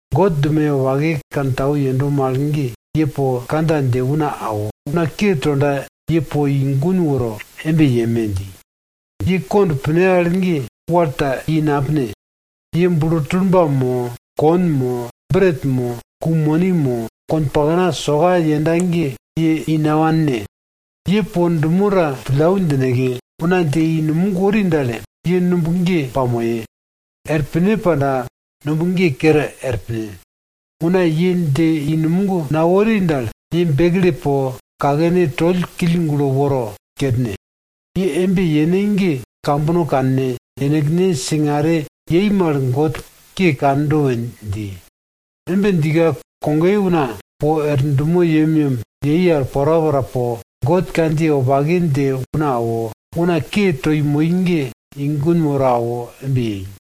God dumoye wopake kantau yendo mal ge, ye po kandja dje una awo, una ke tonda ye po i gun worne. Ye kond pine al ge wal ta i napine. Ye bulo tulba mo, kon mo, bret mo, ku moni mo, konpakna soka yenda ge ye i nawanne. Ye po dumo ta pillau djineke, una dje i numog wori dal, ye numb ge pamoye. Er pine pandaka, numb ge kere er pine. Una ye dje i numog nawori dal, ye bekle po kakene toll kill gulo woro kerne. Ye embe yene ge kambono kanne, yenekne singare ke yei mal God ke kando dje piye we dji. Embe djika kogoye una po er dumo yemyem yei al porapora po, God kandjiye wopake dje una awo, una ke toi moi ge i gun woro awo embe yei.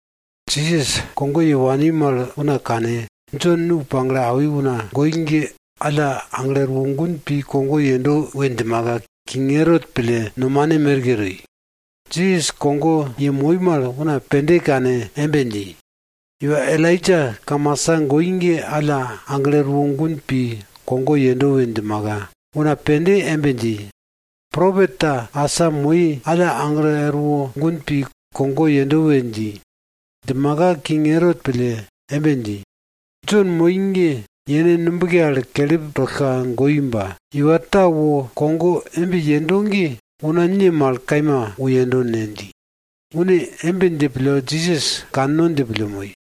Jisas kogo ye wani mal una kane, Jon nu pagle awi una goi ge alla aglo erwo gun pi kogo yendo we djimaka, king Erot pille nomane merke toi. Jisas kogo yemoi mal una pende kane embe dji, iwa Elaija kamasa goi ge alla aglo erwo gun pi kogo yendo we djimaka, una pende embe dji, propet ta asa goi alla aglo wo gun pi kogo yendo we dji. Djimaka king Erot pille embe dji, Jon moi ge yene nubke al kelip tollka goi ba, iwa ta wo kogo embe yendo ge una ne mal kaima wo yendo ne? dji. Une embe dje pille Jisas kanno dje pille moi.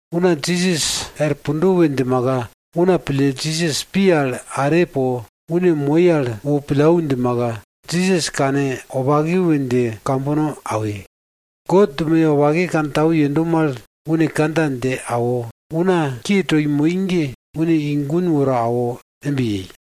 Una Jisas er pundo we djimaka, una pille Jisas pi al are po une moi al pillau djimaka, Jisas kane wopake we dje kambono awi. God dumoye wopake kantau yendo mal, une kandja dje awo, una ke toi moi ge une i gun woro awo embe yei.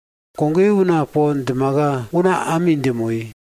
Kogoye una po djimaka, una ami dje moi.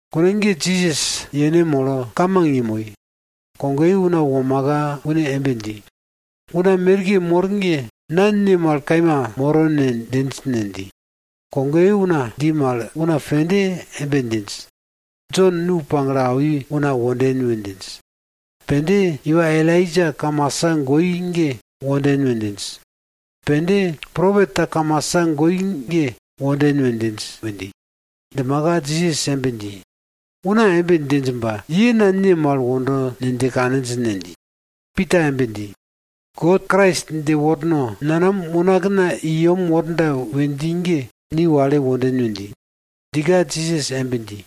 Kune ge Jisas yene molo, kamang yemoi. Kogoye una womaka une embe dji, una merke mor ge na una ne mal kaima moro we djinj ne? dji. Kogoye una dji mal, una pende embe djinj, Jon nu pagle awi una wonden we djinj. Pende, Iwa Elaija kamasa goi ge wonden we djinj. Pende, Propet ta kamasa goi ge wonden we djinj we dji. Djimaka Jisas embe dji, una embe djinj ba, ye na una ne mal wondo dje kaninj ne? dji. Pita embe dji, God, Krais dje worno nanam unakna i yem worda we dji ge ni wale wonden we dji. Djika Jisas embe dji,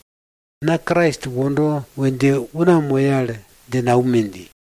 na Krais wondo we dje una moye al dje naume! dji.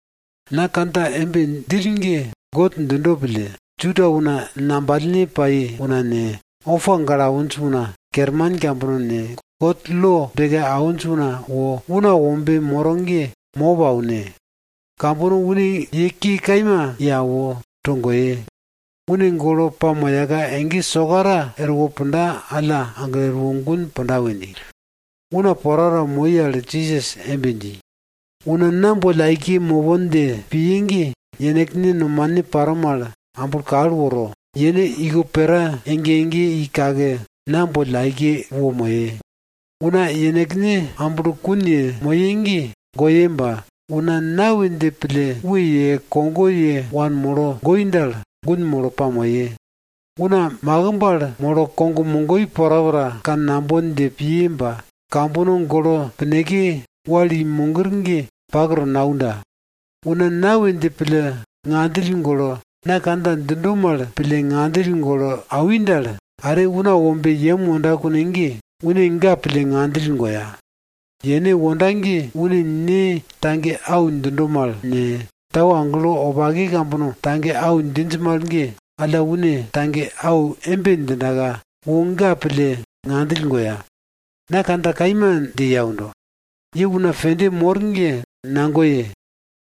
Na kandja embe djill ge God djindo pille, Juda una ngambalne pai una ne, opa gale awinj una kerman kambono ne, God lo beke awinj una wo Una Wombe moro ge mop aune. Kambono une ye ke kaima ye awo, togoye. Une golo pamoyaka, ege sokara erwo pundaka alla aglo erwo gun punda we dji. Una porapora moi al Jisas embe dji, una na boll aike mopon dje piye ge, yenekne nomane paro mal amblo kal woro, yene iko pera ege ege i kake, na boll aike wo moye. Una yenekne amblokun yemoye ge, goye ba, una na we dje pille we ye, kogo ye wanmolo goi dal, gun molo pamoye. Una makimb al molo kog mogoi porapora kannambon dje piye ba, kambono golo pineke wal i mogir ge pak to naunda. Una na we dje pille ngandjill golo, na kandja djindo mal pille ngandjill golo awi dal, are Una Wombe yem wonda kune ge, une ga pille ngandjill goya. Yene wonda ge une Ne ne, tau agelo wopake kambono tage au djinj mal ge, alla une tage au embe djindaka, wo ga pille ngandjill goya. Na kandja kaima dje ye aundo, ye una pende mor ge nagoye,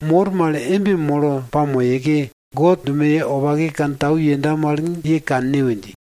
mor mal embe molo pamoyeke, God dumoye wopake kantau yenda mal ye kanne we dji.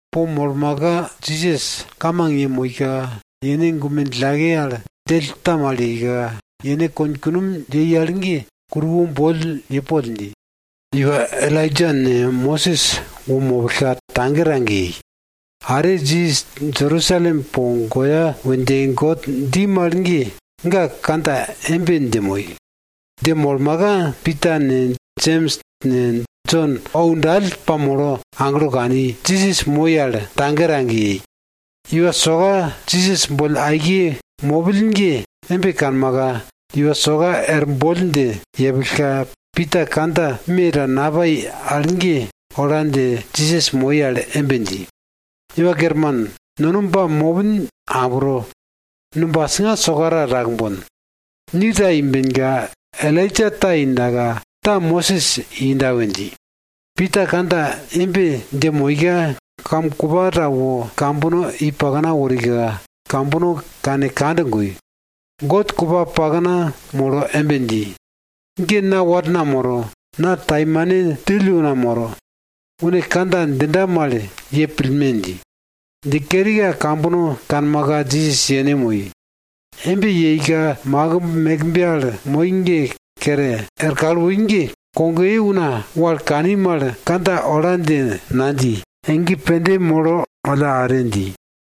Po molmaka Jisas kamang yemoika, yene gume djillake al djell ta mal yeika, yene konye kunomye al ge kuruwo boll ye poll dji. Iwa Elaija ne, Mosis wo mopillka tage tage yei. Are Jisas Jerusalem po goya we dje God dji mal ge, ga kandja embe dje moi. Dje molmaka Pita ne, Jems ne, Jon ou dall pamolo aglo kani, Jisas moi al tage tage yei. Iwa soka Jisas boll aike mopill ge embe kanmaka, iwa soka er boll dje yepillka, Pita kandja me ta napai al ge ola dje Jisas moi al embe dji, Iwa Kerman, nono ba mopin abro. Numb asinga sokara takbon. Ni ta imbenka, Elaija ta indaka, ta Mosis inda we dji. Pita kandja embe dje moika, kam kupa ta wo kambono i pakna worika, kambono kane kand goi. God kupa pakna molo embe dji, ge na warna moro. Na taimane djill una moro. Une kandja djinda mal ye pillme! dji. Dje kerika kambono kanmaka, Jisas yene moi. Embe yeika makimb mekbe al moi ge kere er kal woi ge, kogoye una wal kani mal, kandja ola dje nadji, ege pende molo alla are dji.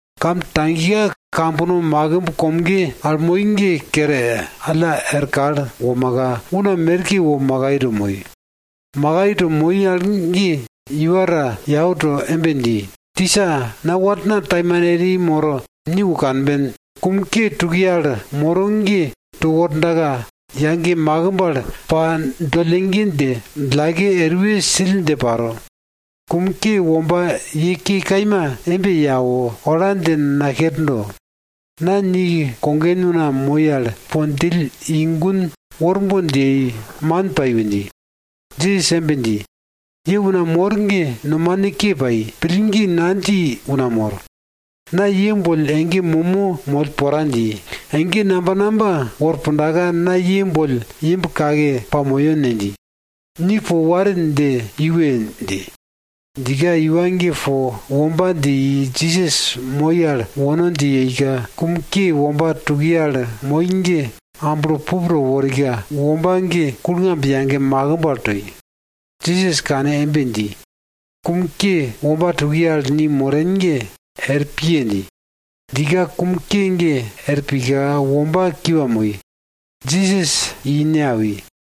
Kam tagika kambono makimb komge al moi ge kere alla er kal womaka, una merke wo makai to moi. Makai to moi al ge iwa ta yau to embe dji, tisa, na warna taimane eri moro ni wo kanben. Kum ke tukiye al moro ge to wordaka, yage makimb al pa dollege dje, djillake eruwe sill dje paro. Kum ke womba ye ke kaima ye awo, ola dje nakerdo. Na ni kogen una moi al po djill i gun worbon dje yei, man pai we dji. Jisas embe dji, ye una mor ge nomane ke pai, pillgi nadji una mor. Na ye boll ege momo moll pora dji. Ege namba namba, na ye boll imb kake pamoyo ne? dji. Ni po warin dje iwe! dji. Djika iwa ge po womba dje i Jisas moi al wono dje yeika, kum ke womba tukiye al moi ge, amblo killmau to worika, womba ge kulngamb yage makimb al toi. Jisas kane embe dji, kum ke womba tukiye al ni moren ge, er piye! dji. Djika kum ke ge er pika, womba kiwa moi, Jisas i ne awi.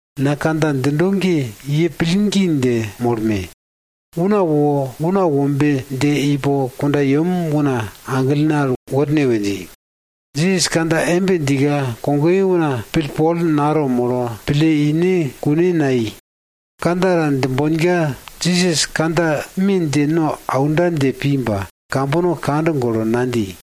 na kandja djindo ge ye pillgi dje molme! Una wo Una Wombe dje ipo kundayem una aglene al worne we dji. Jisas kandja embe djika, kogoye una pillpol nato molo, pille ine kune nayei. Kandja ta djimbonka Jisas kandja me dje no aunda dje pi ba, kambono kand golo nadji.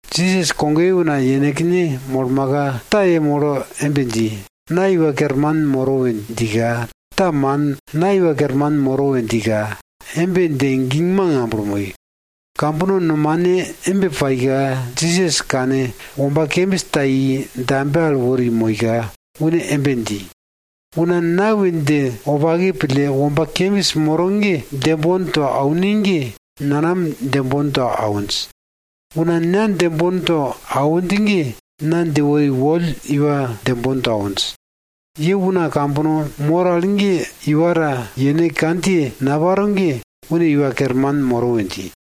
Jisas kogoye una yenekne molmaka, ta yemolo embe dji, na iwa kerman moro we djika ta, man, na iwa kerman moro we djika embe dje gingmang amblo moi. Kambono nomane embe paika, Jisas kane womba kembis ta i dambe al wori moika, une embe dji, una na we dje wopake pille womba kembis moro ge djembon to aune ge, nanam djembon to awinj. Una na djembon to awinj ge, na dje wori woll iwa djembon to awinj. Ye una kambono mor al ge iwa ta yene kandjiye naparo ge, une iwa kerman moro we dji.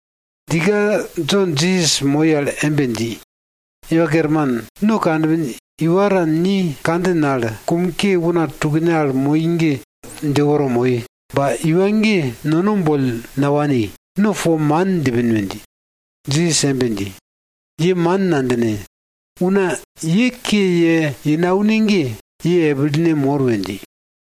Djika Jon Jisas moi al embe dji, Iwa Kerman, no kanpin iwa ta ni kandjin al kum ke una tukne al moi ge, dje woro moi, ba iwa ge nono boll nawani, no po man djipin we dji. Jisas embe dji, ye man nadjine. Una ye, ye ke ye naune ge, ye epilene mor we dji.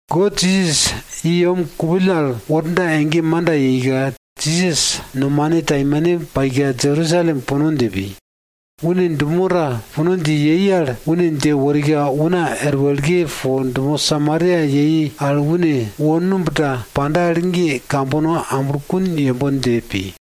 God Jisas i yem kupill al worda ege manda yeika, Jisas nomane taimane paika Jerusalem puno dje pi. Une dumo ta puno dje yei al, une dje worika una er wekle po dumo Samaria une wo numb ta panda al ge kambono amblokun yembon dje pi.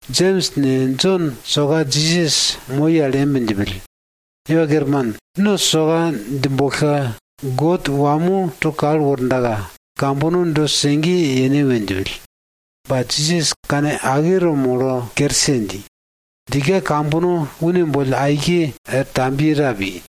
Jems ne, Jon soka Jisas moi al embe djipill, Iwa Kerman, no soka djimbollka God wamo to kal wordaka, kambono do sege yene we djipill. Ba, Jisas kane ake to molo kerse dji. Djika kambono une boll aike er tambiye ta pi.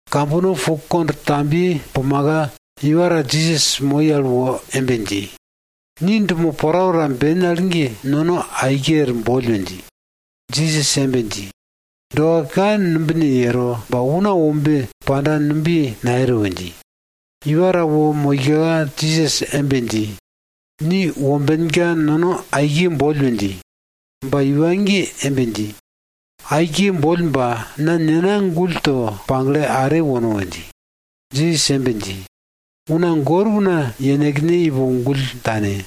Kambono po kondwe tambiye pumaka, iwa ta Jisas moi al wo embe dji, ni dumo porapora ben al ge, nono aike er boll we dji. Jisas embe dji, doa ka numbine yero ba Una Wombe panda numbiye nayero we dji. Iwa ta wo moika, Jisas embe dji, ni wombenka nono aike boll we dji. Ba iwa ge embe dji, aike boll ba, na nena gull to pagle are wono we dji. Jisas embe dji, una gor una yenekne ipo gull tane.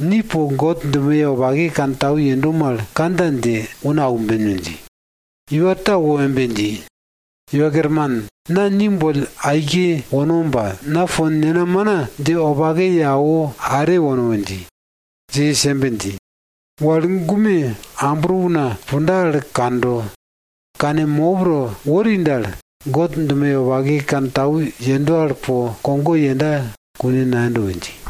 Ni po God dumoye wopake kantau yendo mal, kandja dje una aumben we dji. Iwa ta wo embe dji, Iwa Kerman, na ni boll aike wono ba, na po nena mana dje wopake ye awo are wono we dji. Jisas embe dji, wal gume ambro una punda al kando, kane mop to wori dal, God dumoye wopake kantau yendo al po kogo yenda kune nayendo we dji.